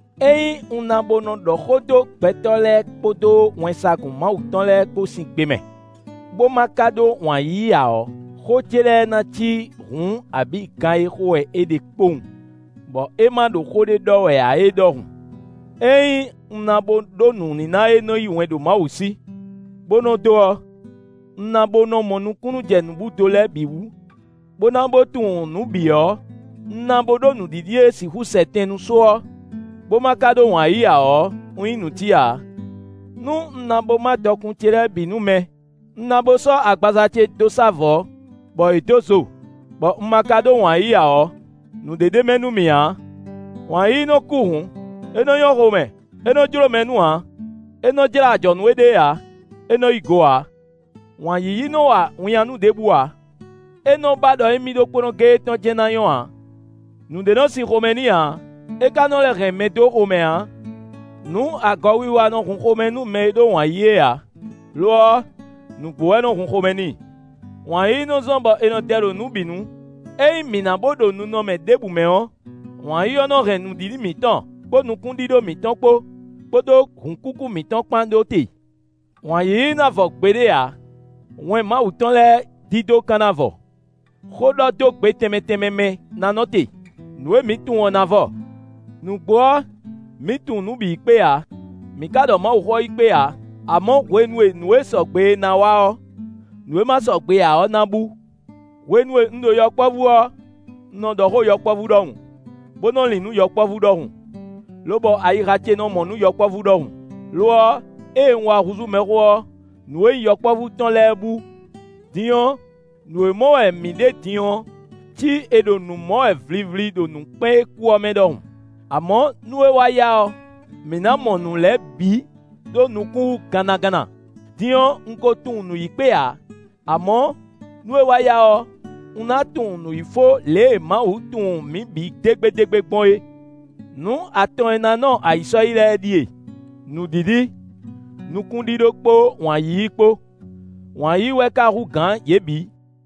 Ényí un ná bo nɔ ɖɔ xó dó gbɛtɔ́ lɛ́ɛ kpódó wɛnsagun Mawu tɔn lɛ́ɛ kpó sín gbe mɛ, bó ma ka ɖó wǎn yíyí ǎ ɔ́, xó ce lɛ́ɛ ná cí hǔn abǐ gan e xo wɛ è ɖe kpowun, bɔ é ma ɖo xó ɖě ɖɔ wɛ ǎ é ɖɔhun. Ényí un ná bo ɖó nǔníná e nɔ yí wɛn ɖo Mawu sí, bó nɔ dó ɔ́, un ná bó mɔ nukúnnú jɛ nǔbúdo lɛ́ɛ bǐ wú, bó ná bó tunwun nǔ bǐ ɔ́, un ná bó ɖó nǔɖiɖi e sixú sɛ tɛn nú só ɔ́, bó ma ka ɖó wǎn yíyí ǎ ɔ́, un nyí nǔtí ǎ. Nú un ná bó má dɔkun ce lɛ́ɛ bǐ nú mɛ, un na bo sɔ́ agbaza ce dó sá vɔ̌, bɔ è dǒ zo, bɔ un ma ka ɖó wǎn yíyí ǎ ɔ́, nǔɖé ɖ'é mɛ nú mì ǎ. Wǎn yíyí nɔ kú hǔn; é nɔ nyɔ́ xomɛ; é nɔ jló mɛ nú ǎ; é nɔ́ jlá ajɔ̌ nú éɖée ǎ; é nɔ́ yí go ǎ. Wǎn yíyí nɔ́ wa winnyánú ɖěbǔ ǎ; é nɔ́ ba ɖɔ émí ɖokpónɔ géé tɔn jɛ́n ná nyɔ́ ǎ; nǔɖé nɔ́ sin xomɛ n'i ǎ; é ka nɔ lɛ́ hɛn mɛ dó xomɛ ǎ. Nǔ agɔ wiwa wɛ nɔ hun xomɛ nú mɛ e ɖó wǎn yíyí é ǎ; lo ɔ́, nǔgbó wɛ nɔ hun xomɛ n'i. Wǎn yíyí nɔ́ zɔ́n bɔ è nɔ dɛ ɖo nǔ bǐ nu; ényí mǐ ná bó ɖo ninɔmɛ ɖěbǔ mɛ ɔ́, wǎn yíyí ɔ́ nɔ hɛn nǔɖiɖi mǐtɔn, kpó nukúnɖíɖó mǐtɔn kpó, kpódó hǔnkúkú mǐtɔn kpán ɖó te. Wǎn yíyí ná vɔ gbeɖé ǎ; wɛn Mawu tɔn lɛ́ɛ dídó ka ná vɔ; xó ɖɔ dó gbe tɛnmɛ tɛnmɛ mɛ ná nɔ te; nǔ e mǐ tunwun ɔ́ na vɔ. Nǔgbó ɔ́, mǐ tunwun nǔ yi kpé ǎ; mǐ ka ɖɔ Mawuxó ɔ́ yi kpé ǎ. Amɔ̌, hwenu e nǔ e sɔgbe é ná wá ɔ́, nǔ e ma sɔgbe ǎ ɔ́ ná bú. Hwenu e un ɖo yɔkpɔ́vú ɔ́, un nɔ ɖɔ xó yɔkpɔ́vú ɖɔhun, bó nɔ lin nǔ yɔkpɔ́vú ɖɔhun, lobɔ ayixa ce nɔ mɔ nǔ yɔkpɔ́vú ɖɔhun; lo ɔ́, ée un wá húzú mɛxó ɔ́, nǔ e nyí yɔkpɔ́vú tɔn lɛ́ɛ bú. Din ɔ́, nǔ e mɔ wɛ mǐ ɖe ɔ́ cí è ɖo nǔ mɔ wɛ vlivli ɖo nǔkpɛ́n e kú ɔ́ mɛ ɖɔhun. Amɔ̌, nú é wá yá ɔ́, mǐ ná mɔ nǔ lɛ́ɛ bǐ ɖó nukún wú gannaganna; din ɔ́, un ko tunwun nǔ yi kpé ǎ; amɔ̌, nú é wá yá ɔ́, un ná tunwun nǔ yi fó lě e Mawu tunwun mǐ bǐ dégbédégbé gbɔn é. Nǔ atɔn e ná nɔ ayǐ sɔ́yi lɛ́ɛ ɖíe: nǔɖiɖi, nukúnɖíɖó kpó wǎn yíyí kpó; wǎn yíyí wɛ ka hú gǎn yě bǐ.